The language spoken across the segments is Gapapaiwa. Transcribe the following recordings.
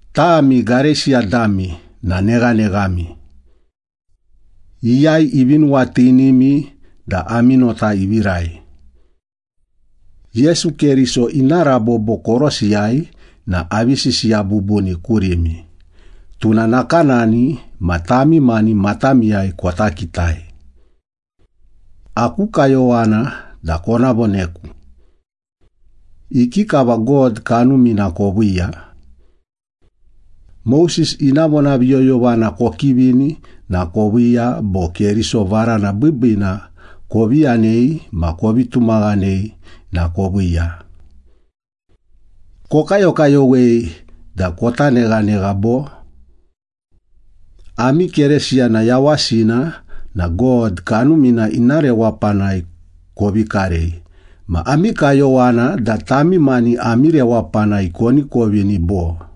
Tami Gareisiya dami na neghaneghami! Iyai ivi nuwatinimi da ami nota ivirai? Yesu Keriso ina rabobo korosiyai na avi sisiya bubuni kurimi, tuna nakanani ma tami mani matamiyai kota kitai. Aku kayowana da kona voneku. Ikikava God Kanumina koviiya? Moses ina vonaviyoyovana kokivini na koviiya, bo Keriso varana biibiina kovi yanei ma kovi tumaghanei na koviiya? Kokayokayowei da kota neghanegha bo? Ami Keresiyana yawasina na God Kanumina ina rewapanai kovi karei ma ami kayowana da tami mani ami rewapanai koni kovini, bo?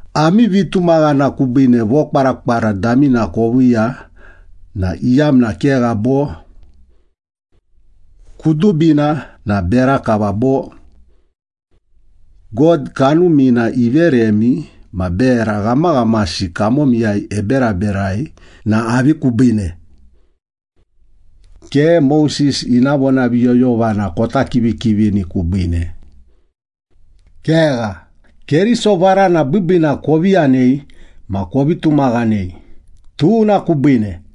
Ami vitumaghana kubiine vokwarakwara damina koviiya na iyamna kegha, bo? Kudubina na bera kava bo? God Kanumina iveremi ma bera ghamaghamasi kamomiyai eberaberai na avi kubiine? Ke Moses ina vonaviyoyovana kota kivikivini kubiine. Kegha, Keriso varana biibiina kovi yanei ma kovi tumaghanei, tuna kubiine.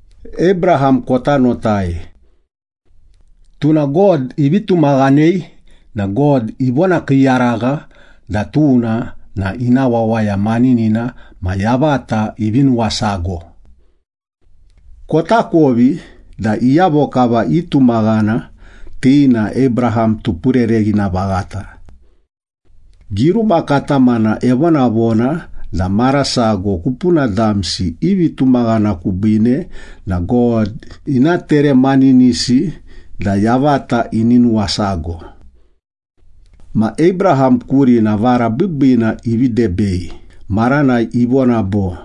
Abraham kota notai. “Tuna God ivi tumaghanei na God ivonakiiyaragha da tuna na ina wawaya maninina ma yavata ivi nuwasago.” Kotakovi da iyavo kava itumaghana, ti na Abraham tupurereghina vaghata. Giruma katamana evonavona da mara sago kupuna damsi i vitumaghana kubiine na God ina teremaninisi da yavata ini nuwasago. Ma Abraham kurina vara biibiina ivi debei maranai ivona bo,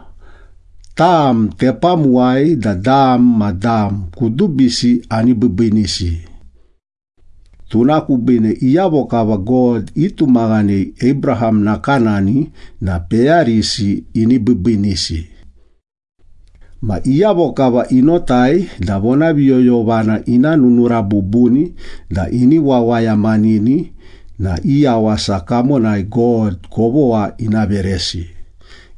“Tam tepamuwai da dam ma dam kudubisi ani biibiinisi.” Tuna kubiine iyavo kava God itumaghanei Abraham nakanani na peyarisi ini biibiinisi. Ma iyavo kava inotai da vonaviyoyovana ina nunura bubuni da ini wawayamanini na i yawasa kamonai God kovogha ina veresi,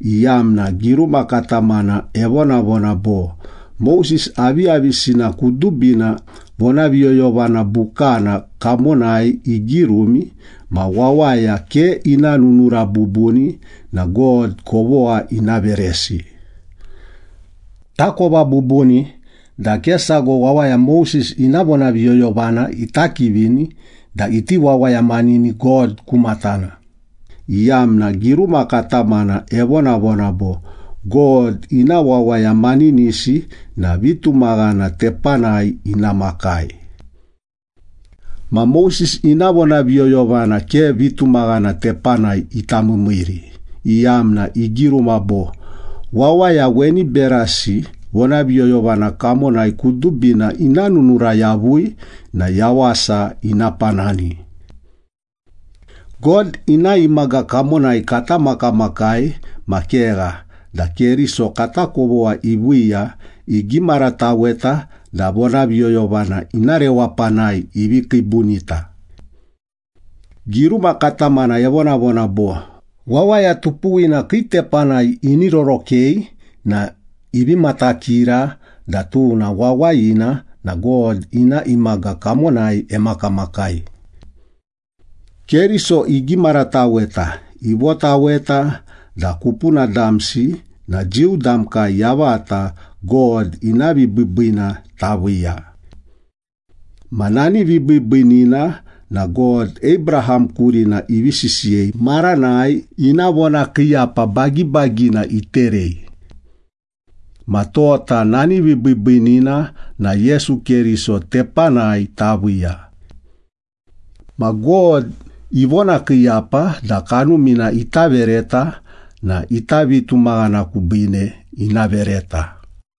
iyamna giruma katamana evonavona bo, “Moses aviyavisina kudubina vonaviyoyovana bukana kamonai igirumi, ma wawaya ke ina nunura bubuni na God kovogha ina veresi.” Takova bubuni da ke sago wawaya Moses ina vonaviyoyovana ita kivini da iti wawayamanini God ku matana, iyamna giruma katamana evonavona bo, “God ina wawaya maninisi na vitumaghana tepanai ina makai.” Ma Moses ina vonaviyoyovana ke vitumaghana tepanai ita miimiiri, iyamna igiruma bo, “Wawaya weni berasi vonaviyoyovana kamonai kudubina ina nununura yavui na yawasa ina panani.” God ina imaga kamonai kata makamakai ma kegha da Keriso kata kovogha iviiya, igimarataweta da vonaviyoyovana ina rewapanai ivi kiibunita. Giruma katamana evonavona bo, “Wawaya tupuwina kii tepanai ini rorokei na ivi matakira da tuna wawayina na God ina imaga kamonai emakamakai.” Keriso igimarataweta, ivotaweta da kupuna damsi na Jiu damkai yavata God ina vibiibiina taviiya. Ma nani vibiibiinina na God, Abraham kurina ivi sisiyei maranai ina vonakiiyapa bagibagina iterei. Ma tota nani vibiibiinina na Yesu Keriso tepanai taviiya. Ma God ivonakiiyapa da Kanumina ita vereta na ita vitumaghana kubiine ina vereta.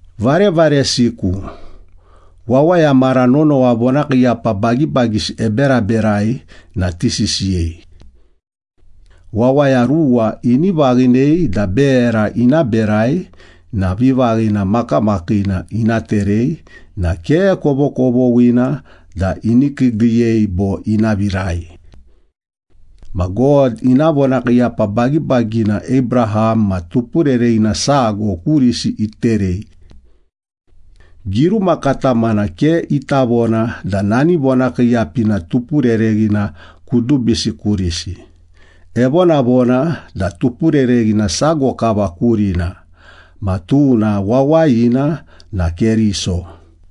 Varevaresiku, wawaya mara nonowa vonakiiyapa bagibagisi eberaberai na tisisiyei. Wawaya ruwa ini vaghinei da bera ina berai na vivaghina makamakiina ina terei na ke kovokovoghina da ini kiigiiyei bo ina virai. Ma God ina vonakiiyapa bagibagina Abraham ma tupurereghina sago kurisi iterei. Giruma katamana ke ita vona da nani vonakiiyapina tupurereghina kudubisi kurisi, evonavona da tupurereghina sago kava kurina, ma tuna wawayina na Keriso.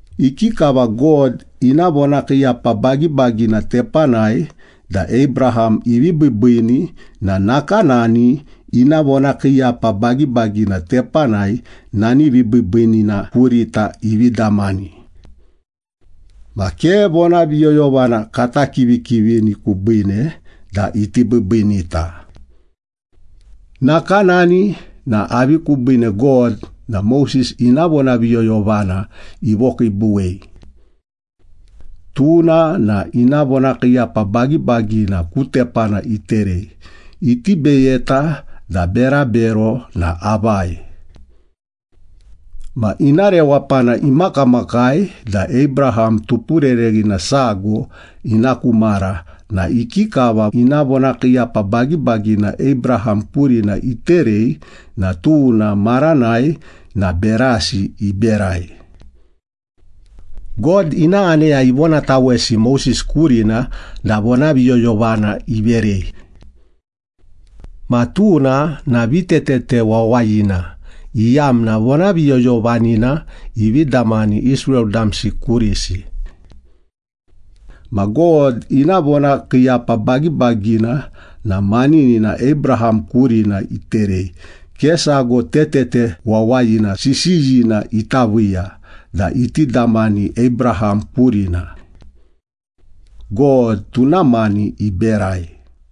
Ikikava God ina vonakiiyapa bagibagina tepanai da Abraham ivi biibiini na nakanani ina vonakiiyapa bagibagina tepanai nani vibiibiinina kurita ivi damani. Ma ke vonaviyoyovana kata kivikivini kubiine da iti biibiinita. Nakanani na avi kubiine God na Moses ina vonaviyoyovana ivokiibuwei? Tuna na ina vonakiiyapa bagibagina ku tepana iterei, iti beyeta da berabero na avai. Ma ina rewapana imakamakai da Abraham tupurereghina sago ina ku mara na ikikava ina vonakiiyapa bagibagina Abraham kurina iterei na tuna maranai na berasi iberai. God ina aneya ivonatawesi Moses kurina da vonaviyoyovana iverei. Ma tuna na vitetete wawayina, iyamna vonaviyoyovanina ivi damani Israel damsi kurisi. Ma God ina vonakiiyapa bagibagina na maninina Abraham kurina iterei, ke sago tetete wawayina sisiyina ita viiya da iti damani Abraham kurina. God tuna mani iberai.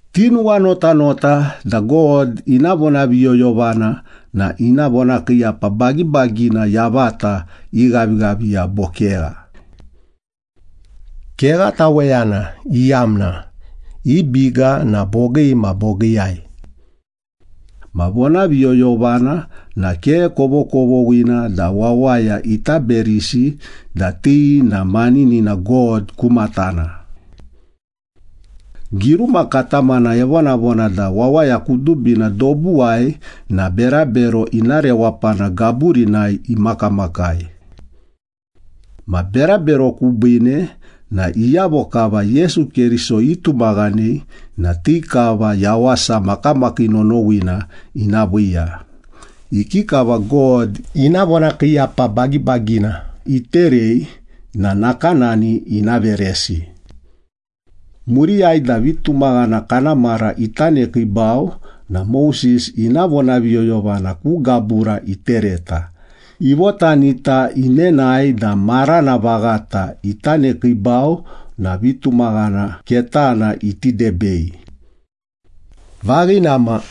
Tinuwanuwanotanota da God ina vonaviyoyovana na ina vonakiiyapa bagibagina yavata ighavighaviya bo kegha. Kegha taweyana, iyamna i biga na bogii ma bogiiyai. Ma vonaviyoyovana na ke kovokovoghina da wawaya ita berisi da ti na maninina God ku matana. Giruma katamana evonavona da wawaya kudubina dobuwai na berabero ina rewapana gaburinai imakamakai. Ma berabero kubiine na iyavo kava Yesu Keriso itumaghanei na ti kava yawasa makamakii nonowina ina viiya, ikikava God ina vonakiiyapa bagibagina iterei na nakanani ina veresi. Muriyai da vitumaghana kana mara ita nekiibau na Moses ina vonaviyoyovana ku gabura itereta, ivotanita inenae da marana vaghata ita nekiibau na vitumaghana ketana iti debei. Vaghina ma,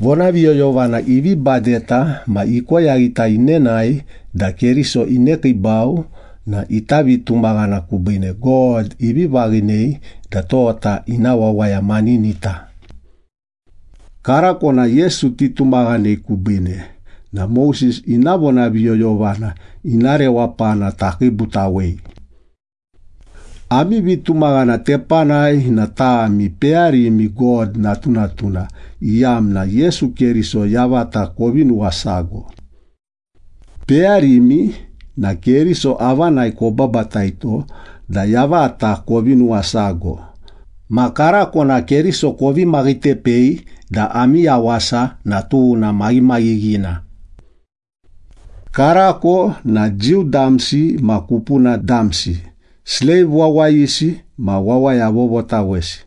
vonaviyoyovana ivi badeta ma ikoyaghita inenae da Keriso inekiibau na ita vitumaghana kubiine God ivi vaghinei da tota ina wawaya maninita. Karako na Yesu titumaghanei kubiine na Moses ina vonaviyoyovana ina rewapana takiibutawei. Ami vitumaghana tepanai na tami peyarimi God natunatuna, iyamna Yesu Keriso yavata kovi nuwasago. Peyarimi na Keriso avanai kobabataito da yavata kovi nuwasago, ma karako na Keriso kovi maghitepei da ami yawasa na tuna maghimaghighina. Karako na Jiu damsi ma kupuna damsi, sleiv wawayisi ma wawaya vovotawesi,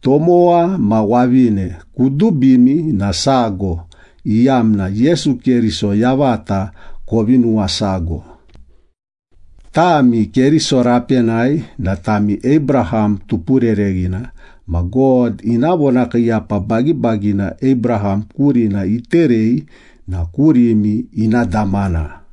tomowa ma wavine, kudubimi na sago, iyamna Yesu Keriso yavata kovi nuwasago. Tami Keriso rapenai na tami Abraham tupurereghina ma God ina vonakiiyapa bagibagina Abraham kurina iterei na kurimi ina damana.